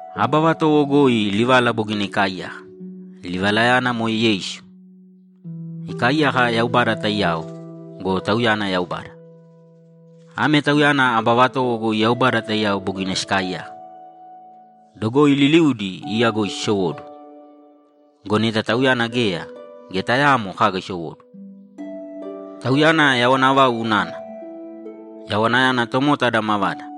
Aba vatowo goi Livala bogina ikaaiyaka. Livalayana moe Yeisu. Ikaaiyaka Yaubada taiyao go, Tauyana Yaubada. Ame Tauyana aba vatowo goi Yaubada taiyao bogina sikaaiyaka. Dogoi liliudi iya goi sisowóduwo. Go neta Tauyana geya, geya tayaamo kaga isowóduwo. Tauyana yawana vau unana. Yawanayana tomota ada mavada.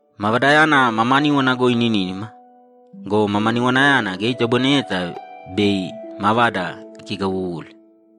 Mavadayana mamaníwana goi ininínima go, mamaniwanayana geya itoboineyeta bei mavada ikigawuwuli.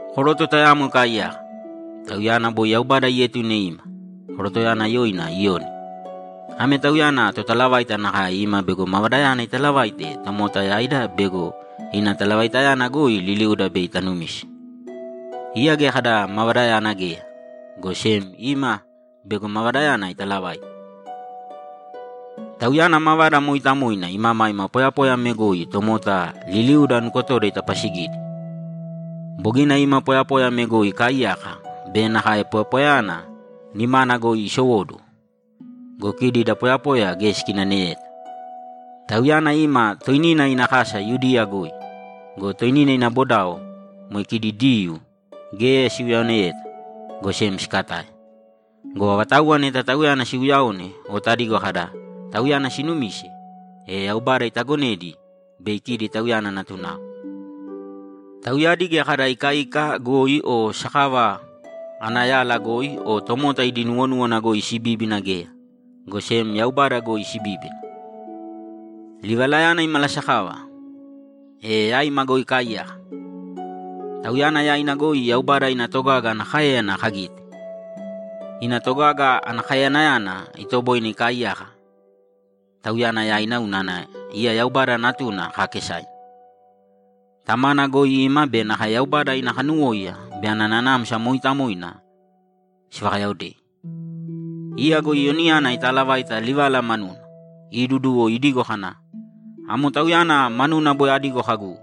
Koroto tayamo ikaaiyaka, tauyana boi Yaubada ietune ima. Korotoyana yoina Iyoni. Ame tauyana totalavaita nakae ima bego Mavadayana italavaite tomota yaida bego ina talavaitayana goi liliuda bei tanumise. Iya geya kada Mavadayana geya, go sem ima bego Mavadayana italavaite. Tauyana Mavada mooitamoina imamaima poyapoya ame goi tomota liliuda nukotoda itapasigidi. Bogina ima poyapoya ame goi ikaaiyaka be nakae poyapoyayana nimana goi isowóduwo go, kidi da poyapoya geya sikinaneyeta. Tauyana ima toinina ina kasa Yudiya goi go, toinina ina bodao, moe kidi Diyuu, geya siuyaoneyeta, go sem sikatae. Go avatauwa neta Tauyana siuyaone o tadigo kada, ‘Tauyana sinumise’, e Yaubada itagonedi bei kidi Tauyana natunao. Tauyadi geya kada ikaika goi o sakava ana yala goi o tomota idi nuwonúwana goi sibíbina geya, go sem Yaubada goi sibíbina. Livalayana imalasakava, e yaima goi ikaaiyaka. Tauyana yaina goi Yaubada ina togaga ana káeyana kagite. Ina togaga ana kaeyanayana itoboine ikaaiyaka Tauyana yaina unana iya Yaubada Natuna kaakesaina; Tamana goi ima be nakae Yaubada ina kanuwóiya be ana Nanamsa Mooitamoina sivakayaodei. Iya go Iyoniyana itaalavaita Livala manuna, iduduwo idigo kana, ‘Amo Tauyana manuna boi adigo kagu,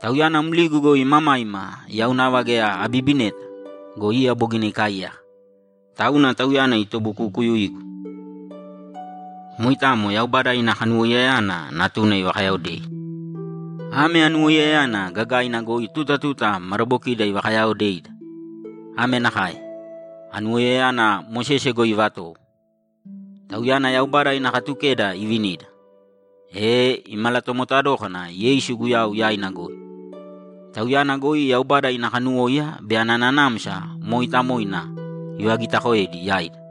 “Tauyana mligu goi imamaima yau nava geya abibineta go, iya bogina ikaaiyaka, tauna Tauyana itobukukuyuigu.”’ Moitamo Yaubada ina kanuwoiyayana Natuna ivakayaodei. Ame anuwoiyayana gagaina goi tuta tuta madabokida ivakayaaodeida. Ame nakae: Anuwoiyayana Mosese goi ivatowo; tauyana Yaubada ina Katukeda ivinida. E imalatomota dókana Yeisu Guyau yaina goi. Tauyana goi Yaubada ina kanuwóiya be ana Nanamsa Mooitamoina ivagitakoedi yaida.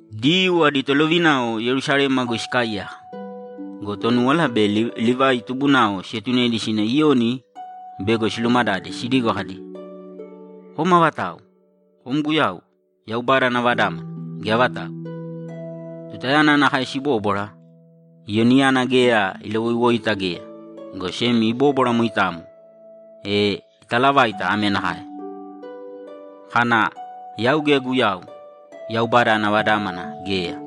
Diyuu adi tolovinao Yerusalema goi sikaaiyaka go, Tonúwala be Livai tubunao sietunedi sina Iyoni bego silumadade sidigo kadi, ‘Kom avatau? Kom Guyau, Yaubada ana Vadámana, gea avatau?’ Tutayana nakae sibóbwara, Iyoniyana geya ilawoiwoita geya, go sem ibóbwara moitamo; e italavaita ame nakae, kana, ‘Yau geya Guyau, Yaubada ana Vadámana, geya.’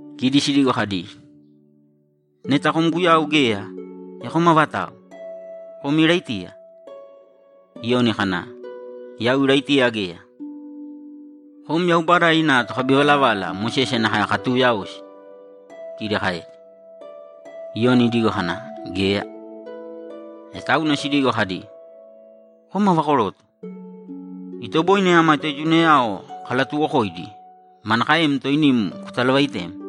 Kidi sidigo kadi, ‘Neta kom Guyau geya, e kom avatau? Kom Iraitiya?’ Iyoni kana, ‘Yau Iraitiya geya.’ ‘Kom Yaubada ina tokabivalavala Mosese nakae katuuyaosi?’ kidi kaedi. Iyoni idigo kana, ‘Geya.’ E tauna sidigo kadi, ‘Kom ava koroto? Itoboine ama toetunayao kalatuwokoidi. Manakaem toinim kutalavaitem?’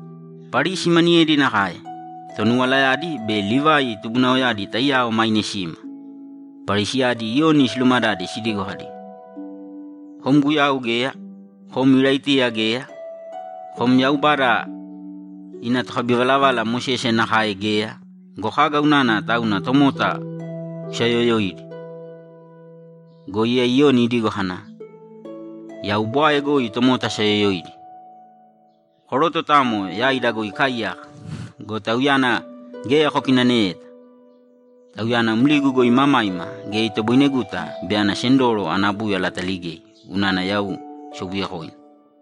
Parisi maniyedi nakae; tonuwalayadi be Livai tubunaoyadi taiyao maine sima. Parisiyadi Iyoni silumadade sidigo kadi, ‘Kom Guyau geya. Kom Iraitiya geya. Kom Yaubada ina tokabivalavala Mosese nakae geya go, kaga unana tauna tomota kusaayoyoidi?’ Go iya Iyoni idigo kana, ‘Yau bwae goi tomota asaayoyoidi. Koroto tayamo yaida goi ikaaiyaka go, Tauyana geya kokinaneyeta. Tauyana mligu goi imamaima geya itoboineguta bei ana sendoro ana búyala ataligei unana yau sobuyekoina.’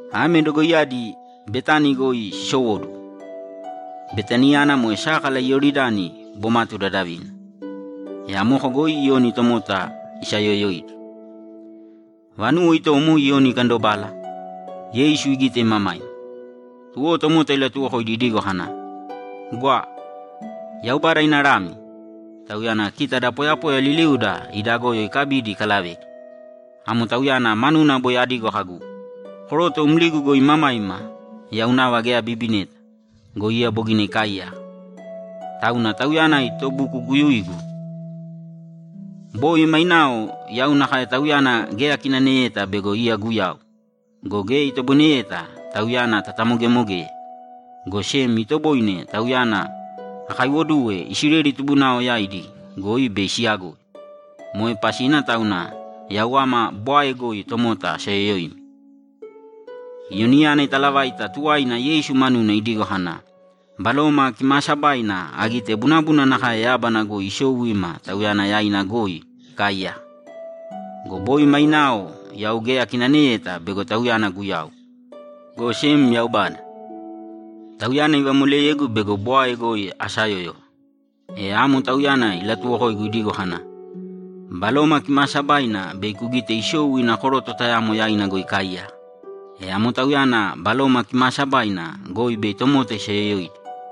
Ame dogoiyadi Betani goi sisowóduwo. Betaniyana moe sákala Iyoridani bomatu dadavina, e amoko goi Iyoni tomota isaayoyoidi. Vanuwo itomo Iyoni ikandobala, Yeisu igite imamaima, tuwo tomota ilatuwokoidi idigo kana, ‘Gwa! Yaubada ina Lami! Tauyana kita da poyapoya liliuda ida goyo ikabidi ikalavedi. Amo Tauyana manuna boi adigo kagu, “Koroto mligu goi imamaima yau nava geya abibineta go, iya bogina ikaaiyaka, tauna Tauyana itobukukuyuigu.” Boi mainao yau nakae Tauyana geya akinaneyeta bego iya Guyau go, geya itoboineyeta Tauyana tatamogemogeye, go sem itoboine Tauyana akaiwoduwe Isileli tubunao yaidi goi bei siyagoi. Moe pasina tauna yau ama bwae goi tomota asayoyoimi.’ Iyoniyana italavaita tuwaina Yeisu manuna idigo kana, ‘Baloma Kimaasabaina agite bunabuna nakae yábana goi isou ima Tauyana yaina goi ikaaiyaka. Go boi mainao yau geya akinaneyeta bego Tauyana Guyau, go sem Yaubada, Tauyana ivamoleyegu bego bwae goi asayóyova, e amo Tauyana ilatuwokoigu idigo kana, “Baloma Kimaasabaina bei kugite isou ina koroto tayamo yaina goi ikaaiyaka. E amo Tauyana Baloma Kimaasabaina goi bei tomota isayoyoidi.”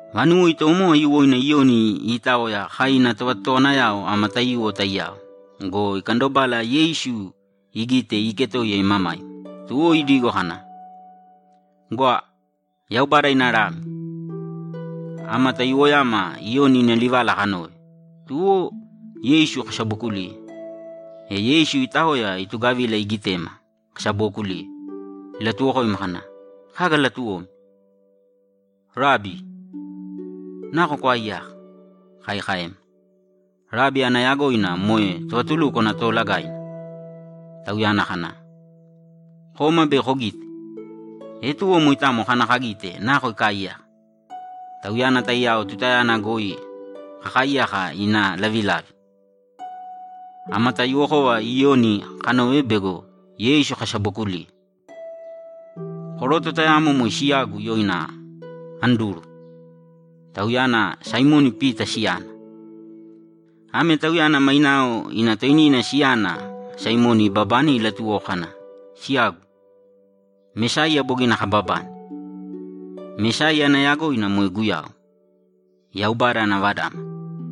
Vanuwo itomo aiyuwoina Iyoni iitaoya kai ina tovatotowanayao ama taiyuwo taiyao go, ikandobala Yeisu igite iiketoiya imamaima, tuwo idigo kana, ‘Gwa, Yaubada ina Lami!’ Ama taiyuwoyama Iyoni ina livala kanove, tuwo Yeisu kasabokuliye. E Yeisu itaoya itugavila igitema kasabookuliye, ilatuwokoima kana, ‘Kaga latuwomi?’ ‘Rabi, nako kwaaiyaka?’ kai kaema. Rabi ana yagoina moe Tovatulúkwana Toolagaina. Tauyana kana, ‘Kōma bei kogite.’ E tuwo moitamo kana kagite nako ikaaiyaka. Tauyana taiyao tutayana goi kakaaiyaka ina lavilavi. Ama taiyuwokova Iyoni kanove be Yeisu kasabokuliye. Koroto tayamo moe siyagu yoina Anduru; tauyana Saimoni Pita siyana. Ame tauyana mainao ina toinina siyana Saimoni ibabane ilatuwoko kana, ‘Siyagu, Mesaiya bogina kababane.’ Mesaiya ana yagoina moe Guyau, Yaubada ana Vadámana.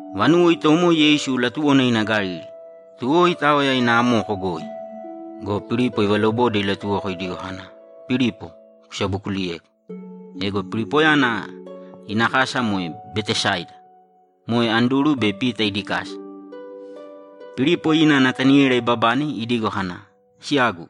Vanuwo itomo Yeisu latuwona ina Galili. Tuwo itaoya ina amoko goi go, Pilipo ivalobode ilatuwoko idigo kana, ‘Pilipo, kusabokuliyēgu!’ Ego Pilipoyana ina kasa moe Betesaida, moe Anduru be Pita idi kasa. Pilipo ina Nataniela ibabane idigo kana, ‘Siyagu,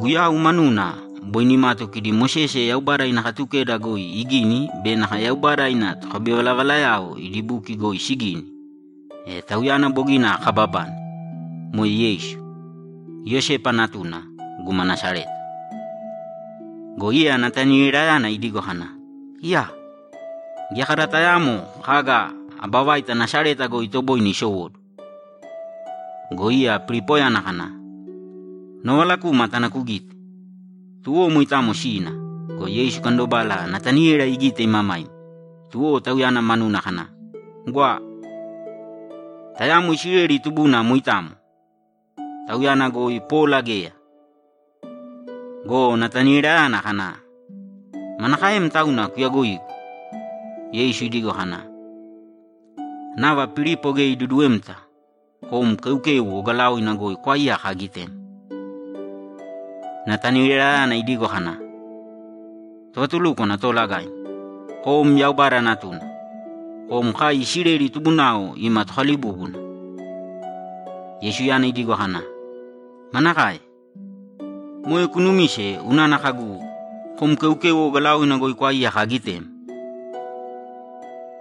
Guyau manuna boi nimatu kidi Mosese Yaubada ina Katukeda goi igini be nakae Yaubada ina tokabivalavalayao idi buki goi sigini, e Tauyana bogina kababane! Moe Yeisu, Iyosepa natuna, guma Nasareta.’ Go iya Natanielayana idigo kana, ‘Iyaa! Geya kada tayaamo kaga aba vaita Nasareta goi itoboine isowóduwo.’ Go iya Pilipoyana kana, ‘Novala kūma tāna kugīte.’ Tuwo moitamo sina go, Yeisu ikandobala Nataniela igite imamaima, tuwo tauyana manuna kana, ‘Gwa! Tayamo Isileli tubuna moitamo! Tauyana goi pola geya!’ Go Natanielayana kana, ‘Manakaem tauna kuyagoigu?’ Yeisu idigo kana, ‘Nava Pilipo geya iduduwemta, kom keukeu ogalaoina goi kwaaiyaka agitem.’ Natanielayana idigo kana, ‘Tovatulúkwana Toolagaim, kom Yaubada Natuna! Kom kai Isileli tubunao ima Tokalibúbuna!’ Yeisuyana idigo kana, ‘Manakae? Moe kunumise unana kagu, “Kom keukeu ogalaoina goi kwaaiyaka agitem”?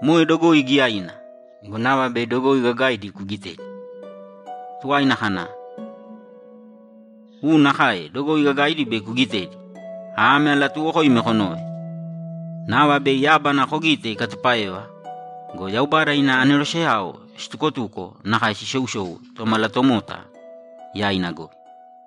Moe dogoi giyaina go, nava bei dogoi gagaidi kugitedi.’ Tuwaina kana, ‘U nakae dogoi gagaidi bei kugitedi! Ame alatuuwokoimi konōve: Nava bei yábana kogite ikatupáeva go, Yaubada ina aneroseyao situkotuko nakae sisousou Tomalatomota yaina goi.’